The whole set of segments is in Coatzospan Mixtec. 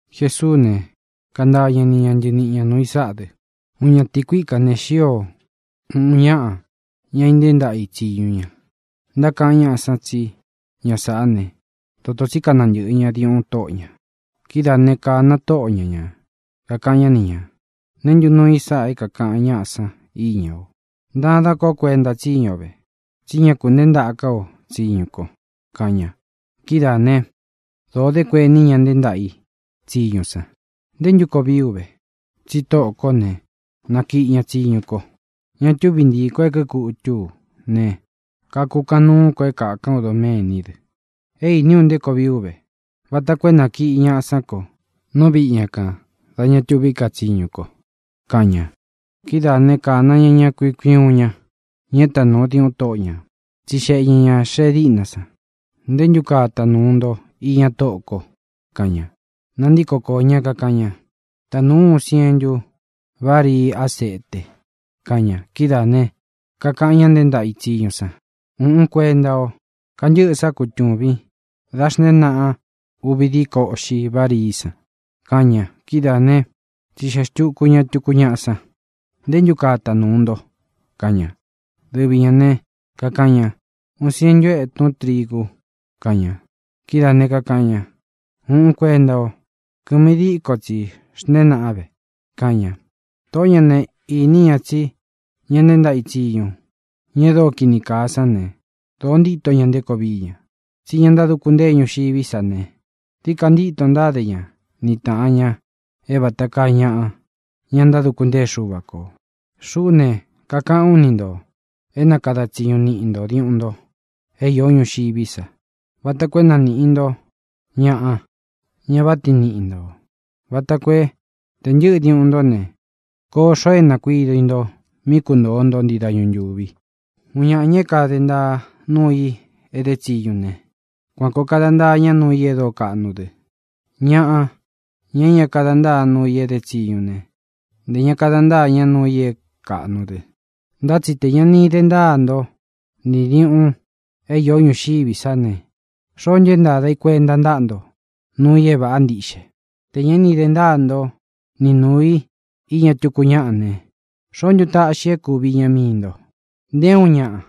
Jesuú ne, kantaa ña ni ña ntɨniꞌi ñā nuu i sáꞌa dɨ: —Uun ñatīí kuika ne, xío uun ñāꞌa, ña intée ntaꞌa i tsīñu ña. Ntákaꞌan ñáꞌa san tsí ña sāꞌá ne, dotō tsí kanantɨꞌɨ ña diuꞌun tóꞌo ñā. Kidáa ne, kāna tóꞌo ña ñā, kakaꞌan ñá ni ñā: “¿Neé ntu nuu i sáꞌa é kākaꞌan ñáꞌa san íña o? Ntadan kó kuenta tsíñu o ve, tsí ña kunteé ntaꞌa ká o tsiñu ko”, kaꞌan ña. Kidáā ne, dóo dé kueni ña nteé ntaꞌa i tsiñu san: “¿Nté ntu koo vií u ve? Tsi tóꞌō kó ne, nakiꞌi ña tsiñu ko. Ña túvi ntiī ko é kīkutú u ne, kakukaꞌan nuú ko é kākán u doméní dɨ. É īní u nté koo vií u ve, vata koo é nakiꞌi ñaꞌa sán ko nú viꞌi ña kān dá ña tuví ka tsiñu ko”, kaꞌan ña. Kidáā né, kāna ña ña kui uun kui uun ña, ña é tanūu diuꞌun tóꞌo ñā. Tsixeꞌe ñā ña xee díꞌna san: “¿Ntē ntú kaa tanūu nto iña tóꞌō ko?”, kaꞌan ña. Nantíko koō ñá, kakaꞌan ña: “Tanūu ú uun sientu varii ásete”, kaꞌan ña. Kidáā ne, kakaꞌán ña nteé ntaꞌa i tsiñu san: “Ūꞌun kuenta o. Kantɨ́ꞌɨ sá kutūvin, dá xntēén naꞌan uvi díko uꞌxi várii tsi”, kaꞌan ña. Kidáā né, tsixeꞌē xtuku ñá tukú ñaꞌa san: “¿Ntē ntú kaa tanūu nto?”, kaꞌan ña. Dɨvi ñā ne, kakaꞌan ña: “Uun sientu etún trigu”, kaꞌan ña. Kidáā ne, kakaꞌan ña: “Ūꞌun kuenta o. Kɨmi díko tsi xnteén naꞌan ve”, kaꞌan ña. Tōꞌó ña ne, īní ña tsi ña nteé ntaꞌa i tsiñu, ña e dóo kīni kaa sán ne, dōo ntíto ña nté koo vií ña. Tsí ña ntáduku ntée ñuxiví sa ne, dií ka ntíto ntáde ña ni tāꞌan ña é vāta kaa ñaꞌa, ña ntáduku ntée Xuva kō. ʼXuꞌú ne, kakaꞌán u ni ntō é na kada tsiñu niꞌi ntō diuꞌun nto é īo ñuxiví sa vata koo é na nīꞌi nto ñaꞌa, ña váꞌa tiin niꞌi ntō, vata koo é, tē ntɨ́ꞌɨ diuꞌun ntó ne, koo xoo é nākuído i nto mí kuntōo nto ntii dañu ntūvi. ʼUun ñaꞌa, ña é kade ntaa núu i é dutsī né, kuan kōo kada ntaa ña nuu i e dóo kaꞌnu dɨ. Ñaꞌa, ña é ña kada ntáa nuu i é dutsí ne, ntē ña kada ntáa ña nuu i é kaꞌnu dɨ. Ntá tsi tē ñá ini de ntáa nto nī diuꞌun é iō ñuxiví sa ne, ¿xoó ntu é ntāda i kuenta ntáꞌa nto nuu i é vāꞌa ntíꞌxe? Tē ñá ini de ntáa nto nī nuu i iña túku ñáꞌa ne, ¿xoó ntu taꞌxi i é kūvi iña mii nto? ʼNté uun ñaꞌa,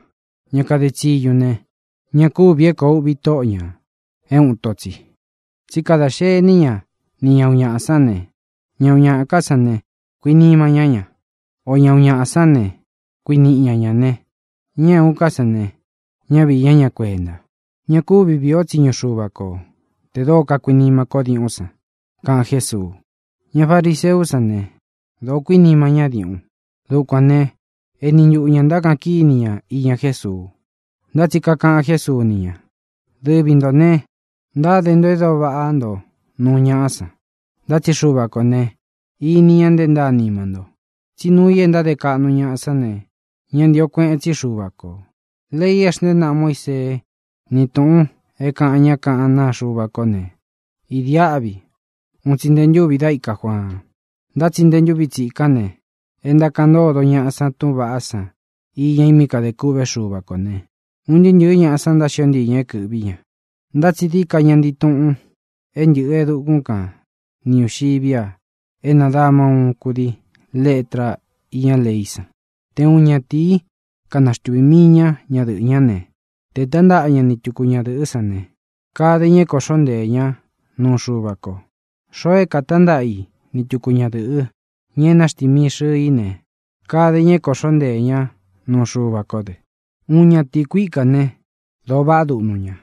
ña kade tsiñu ne, ña kúvī é koo uvi tóꞌo ñā é uun ito tsi. Tsí kada xení ña nī ña uun ñaꞌa sán ne, ña uun ñaꞌa ká san ne, kuinima ñá ña. O ña uun ñaꞌa sán ne, kuiníꞌi ña ña ne, ña é uun ká san ne, ñá viī ñá ña kuenta. Ña kúvi vīi o tsíñu Xuva ko tē dóo kakuinima kó diuꞌún san —kaꞌan Jésuu. Ña fariseú san ne, dōó kuinima ñá diuꞌun. Dukuān né, eni ntuꞌu ñā ntákaꞌan kíni ña iña Jésuu. Ntá tsi kakaꞌan Jésuu ni ña: —Dɨvi ntō ne, ntáde nto e dóo vaꞌá nto nuu ñaꞌá san, ntá tsi Xuva kō ne, ini ña nte ntáa nima nto. Tsí nuu i e ntáde kaꞌnu ñaꞌa sán ne, ñá ntīo kueꞌen tsí Xuva kō. ʼLei é xntēé naꞌa Muísee ni túꞌūn é kaꞌan ñá kaꞌán naa Xuva ko ne, idiáꞌvi un tsi nte ntúvī da íka Juaan. Ntá tsi nte ntúvi tsikán ne, e ntákaꞌan ntódo ñaꞌa san túꞌūn vaꞌá san iña i mí kadē kûꞌvé Xuva kō ne, un ntɨɨ́ ntɨ̄ɨ́ ñaꞌa san ntáxio ntii ñā é kɨ̄ꞌví ña. ʼNtá tsi dií ka ña ntii tuꞌun é ntɨꞌɨ̄ e dukún kan nī ñuxiví a é nadāma uun kudii letra íña leí san. ʼTe uun ñatīí kanaxtuvī mii ña ñadɨꞌɨ́ ña ne, tē tántaꞌa ña ni tuku ñadɨ̄ꞌɨ́ san ne, kade ña é koꞌxo nteē ña nuu Xuva ko. Xoo é kātántaꞌa i ni tuku ñadɨ̄ꞌɨ́, ña e náxtimii xɨ̄ɨ í ne, kade ña é kākóꞌxo nteē ña nuu Xuva kó dɨ. ʼUun ñatīí kuika ne, dōo vaꞌá duꞌnu ña.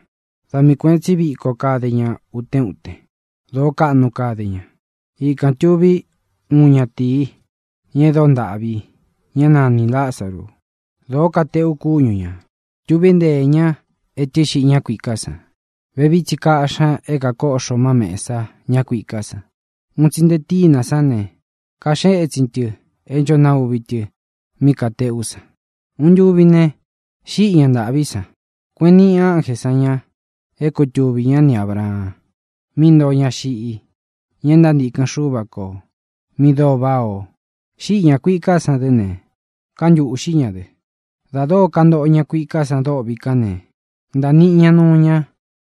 Da mii kuēꞌen tsí viko kade ña utén utén; dōó kaꞌnu kade ña. Ikān tuví uun ñatīi, ña e dóo ntāꞌví, ña é nanī Lázaru. Dōó kateꞌu kúñu ñā. Tuví nteē ñá etɨ́ xiꞌi ñá kuiká san. Vevií tsi kāꞌxí ña é kakóꞌxo má mēsa ñá kuiká san. Un tsi nte tínā sán ne, kaxée ētsin tɨ é ncho nauvi tɨ mí katēꞌú san. Uun ntuvi ne, xíꞌī á ña ntāꞌví san. Kueꞌen níꞌi ánjē san ña é kutuvī ñá ni Ābraan, mí ntoo ña xiꞌi, ña e ntántīkɨn Xúva kō, mi dóo váꞌā o. Xíꞌi ñā kuiká san dɨ́ ne, kántūꞌxí ña dɨ. ʼDā dóo kantoꞌo ña kuiká san dôꞌvi kán ne, ntāniꞌi ña nuu ñá,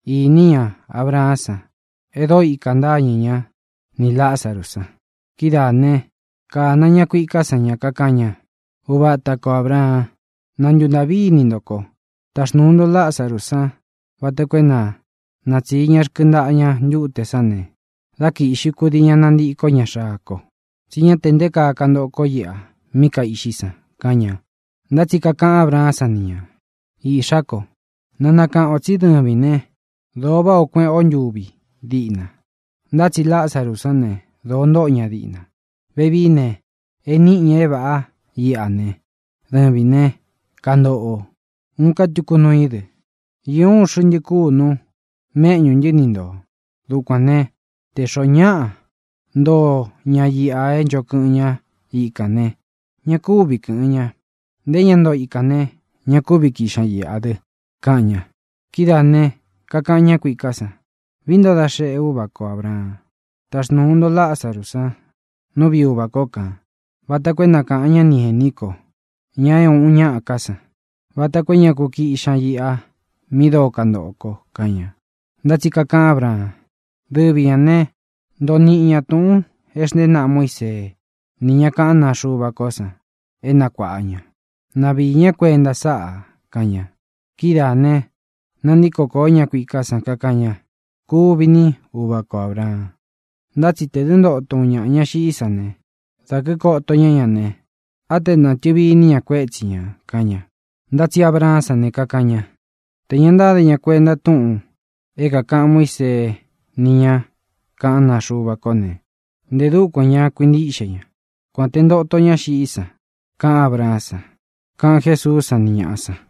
īní ña Abraán san e dóo ikā ntáñɨ ña nī Lázaru san. Kidáa ne, kāna ña kuiká san ña, kakaꞌan ña: “Uvatā kó Abraan, na ntuntāꞌví ini nto ko. Taxnūu nto Lázaru san vata koo é na natsiī ña rkɨntaꞌa ña ntuté san ne, dá kīꞌxi kudii ña nantikó ña xaa ko, tsí ña te nté kaa kantoꞌo ko íꞌa mí kaīꞌxí san”, kaꞌan ña. Ntá tsi kakaꞌan Ábraán san ni ñā: “Iꞌxá ko, na nakaꞌān o tsí dɨvīn né, dōo váꞌā o kueꞌén o ntúvi diꞌna. Ntá tsi Lázaru sán ne, dōo ntóꞌo ña diꞌna. Vevií ne, e níꞌi ñā é vāꞌá iꞌa ne, dɨvīn ne, kantóꞌo o. Uun ká tuku nuu í dɨ: Īó uun xɨꞌntɨ kunu méꞌñū ntɨ́ ni ntō. Dukuān né, tē xoó ñaꞌa ntoo ña iꞌa é ncho kɨꞌɨn ña íkān ne, ña kúvi kɨ̄ꞌɨn ña. Nté ña ntoo ikān ne, ña kúvi kīꞌxi ña iꞌa dɨ”, kaꞌan ña. ʼKidáā ne, kakaꞌan á ña kuiká san: “Vií nto da xeꞌe, úvā kó Abraan, taxnūu nto Lázaru san nú viꞌi uvā kó kān vata koo é na kāꞌan ñá ni ēní ko, ña uꞌun ñaꞌa ká san, vata koo é ña ku kiꞌxi ña iꞌa mi dóo kantoꞌo ko”, kaꞌan ña. Ntá tsi kakaꞌan Ábraan: “Dɨvi ñā ne, ntoo niꞌi ña túꞌūn e xntée naꞌa Muísee ni ña kaꞌán naa Xuva ko san é nakuāꞌa ña. Na viī ñá kuenta sáꞌā”, kaꞌan ña. Kidáā ne, nantíko kōo ñá kuiká san, kakaꞌan ña: “Kuvi ní, uvā kó Abraan, ntá tsi tē dɨ́ ntoto uun ñaꞌa ña xiꞌí san ne, dā kíkoto ñá ña ne, á te natɨ̄vi iní ña kuétsi ñā”, kaꞌan ña. Ntá tsi Abraán san ne, kakaꞌan ña: “Tē ña ntáde ña kuenta túꞌūn é kākaꞌan Muísee ni ña kaꞌán naa Xuva ko ne, nté dukuān ña kuintíꞌxe ña, kuān te ntoto ña xiꞌí san”, kaꞌan Ábraán san —kaꞌan Jésuú san ni ñāꞌa san.